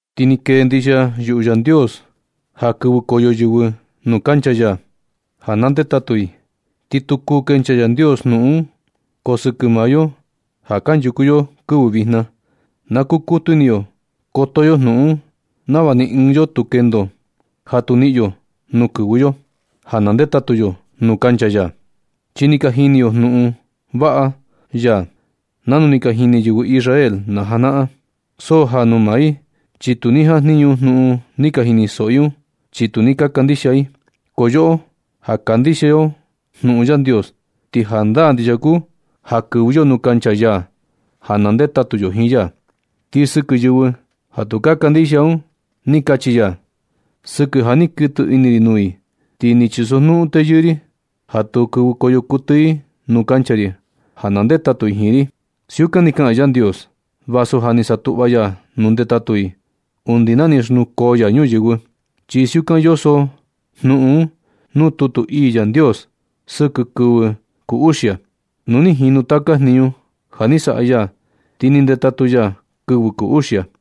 Ti ni kee ndixia yuꞌu Yandios ja kɨvɨkoyo yɨvɨ nuu kancha ya ja na ndetatu i, ti tu kuu kenchaa Yandios jnuꞌun un. Ko sɨkɨ maa yo ja kanchuku yo kɨvɨ vijna, na kukutu ini yo koto yo jnuꞌun un, nava ni ɨɨn yo tu kendo ja tu niꞌin yo nuu kɨvɨ yo, ja na ndetatu yo nuu kancha ya. Chi suni ni ka jini yo jnuꞌun vaꞌa ya nanu ni ka jini yɨvɨ Israel najanaꞌan. So ja nuu maa i, chi tu ni jajniñu jnuꞌun ni ka jinisoꞌo i un, chi tu ni ka kandixia i. Ko yoꞌo ja ka kandixia yo jnuꞌun Yandios, ti jandaa ndixia kuu ja kɨvɨ yo nuu kancha ya ja na ndetatu yo jiin ya. Ti sɨkɨ yɨvɨ ja tu ka kandixia un ni kachi ya: Sɨkɨ ja ni kuɨtɨ ini ri nuu i, ti ni chisojnuꞌun teyɨɨ ri, ja tu kɨvɨkoyo kuɨtɨ i nuu kancha ri ja na ndetatu i jiin ri. Siukan ni kaꞌan Yandios vasu ja ni satuꞌva ya nuu ndetatu i undi na ni xnukoo ya ñuyɨvɨ. Chi siukan yoso jnuꞌun un nuu tutu ii Yandios sɨkɨ kɨvɨ kuu uxia: Nu ni jinu taka jniñu ja ni saꞌa ya, ti ni ndetatu ya kɨvɨ kuu uxia.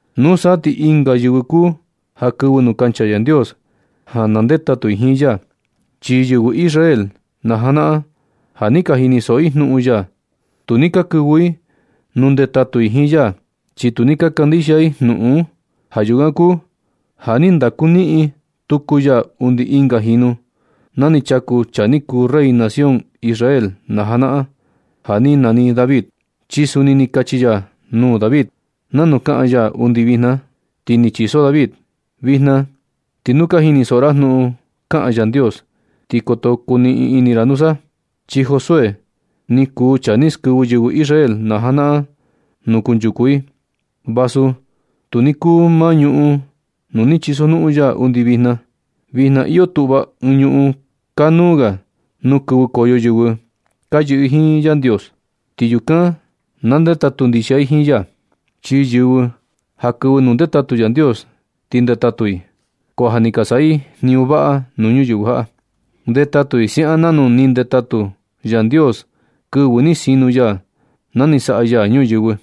Nusa ti ɨnga yɨvɨ kuu ja kɨvɨ nuu kancha Yandios ja na ndetatu i jiin ya. Chi yɨvɨ Israel najanaꞌan ja ni ka jinisoꞌo i jnuꞌun ya, tu ni ka kɨvɨ i nuu ndetatu i jiin ya, chi tu ni ka kandixia i jnuꞌun un. Ja yukan kuu ja ni ndaku niꞌin tuku ya undi ɨnga jinu na ni chaku chaa ni kuu rey nación Israel najanaꞌan ja ni nani David, chi suni ni kachi ya nuu David nanu kaꞌan ya undi vijna, ti ni chiso David: Vijna ti nu ka jinisoꞌo ra jnuꞌun kaꞌan Yandios, ti koto kuniꞌin ini ra nusa. Chi Josué ni kuu chaa ni skɨvɨ yɨvɨ Israel janaꞌan ñuꞌun nuu kunchuku i, vasu tu ni kuu maa ñuꞌun nuu ni chisojnuꞌun ya undi vijna. Vijna iyo tuꞌva ɨɨn ñuꞌun kanuu ga nuu kɨvɨkoyo yɨvɨ ka yɨꞌɨ jiin Yandios, ti yukan ka ndetatu ndixia i jiin ya. Chi yɨvɨ ja kɨvɨ nuu ndetatu Yandios ti ndetatu i, ko ja ni ka saꞌa i jniñu vaꞌa nuu ñuyɨvɨ jaꞌa. Ndetatu i siaꞌan nanu ni ndetatu Yandios kɨvɨ ni sinu ya na ni saꞌa ya ñuyɨvɨ.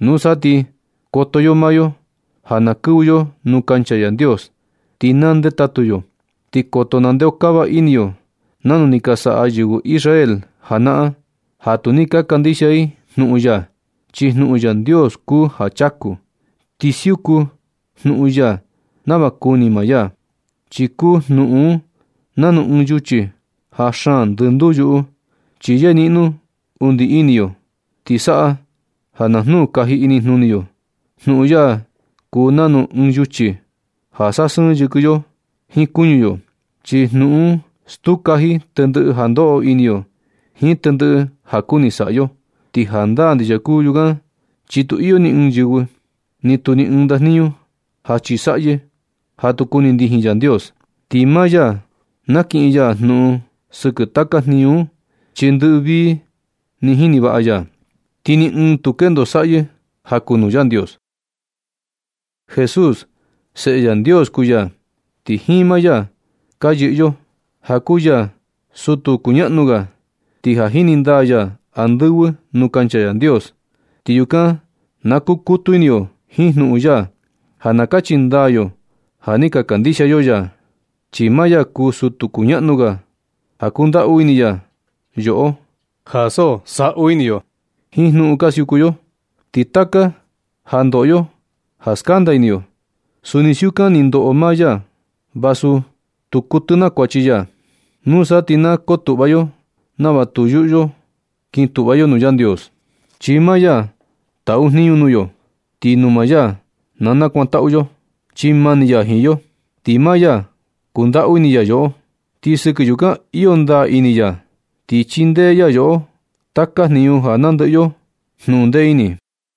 Nusa ti na koto yo maa yo ja na kɨvɨ yo nuu kancha Yandios ti na ndetatu yo. Ti koto nandeokava ini yo nanu ni ka saꞌa yɨvɨ Israel janaꞌan ja tu ni ka kandixia i jnuꞌun ya. Chi jnuꞌun Yandios kuu ja chaku, ti siuku jnuꞌun ya nava kuni maa ya, chi kuu jnuꞌun un nanu ɨɨn yuchi ja xaan ndɨnduu yuꞌu, chi yeniꞌno undi ini yo, ti saꞌa ja na jnuu kaji inijnuni yo. Jnuꞌun ya kuu nanu ɨɨn yuchi ja sasɨɨn yɨkɨ yo jiin kuñu yo, chi jnuꞌun un stuu kaji tendɨꞌɨ ja ndoꞌo ini yo jiin tendɨꞌɨ ja kuni saꞌa yo. Ti jandaa ndixia kuu yukan chi tu iyo ni ɨɨn yɨvɨ, ni tu ni ɨɨn ndajniñu ja chisaꞌyɨ ja tu kuni ndijin Yandios, Ti maa ya nakiꞌin ya jnuꞌun sɨkɨ taka jniñu un, chi ndɨꞌɨ vii ni jini vaꞌa ya, ti ni ɨɨn tu kendo saꞌyɨ ja kuu nuu Yandios. Jesús, Seꞌe Yandios kuu ya, ti jiin maa ya ka yɨꞌɨ yo, ja kuu ya sutu kuñaꞌnu ga, ti ja ni ndaa ya andɨvɨ nuu kancha Yandios. Ti yukan na kukutu ini yo jiin jnuꞌun ya ja na kachi nadaa yo ja ni ka kandixia yo ya. Chi maa ya kuu sutu kuñaꞌnu ga ja kundaꞌu ini ya yoꞌo, ja so saꞌu ini yo jiin jnuꞌun ka siuku yo. Ti taka ja ndoꞌo yo ja skanda ini yo, suni siukan ni ndoꞌo maa ya, vasu tu kuɨtɨ naa kuachi ya. Nusa ti na kotuꞌva yo nava tu yuꞌu yo kin tuꞌva yo nuu Yandios, chi maa ya taꞌu jniñu nuu yo, ti nuu maa ya na kakantaꞌu yo. Chi mani ya jiin yo, ti maa ya kundaꞌu ini ya yoꞌo. Ti sɨkɨ yukan iyo ndaa ini ya, ti chindee ya yoꞌo taka jinu ja nandɨꞌɨ yo jnuꞌun ndee ini.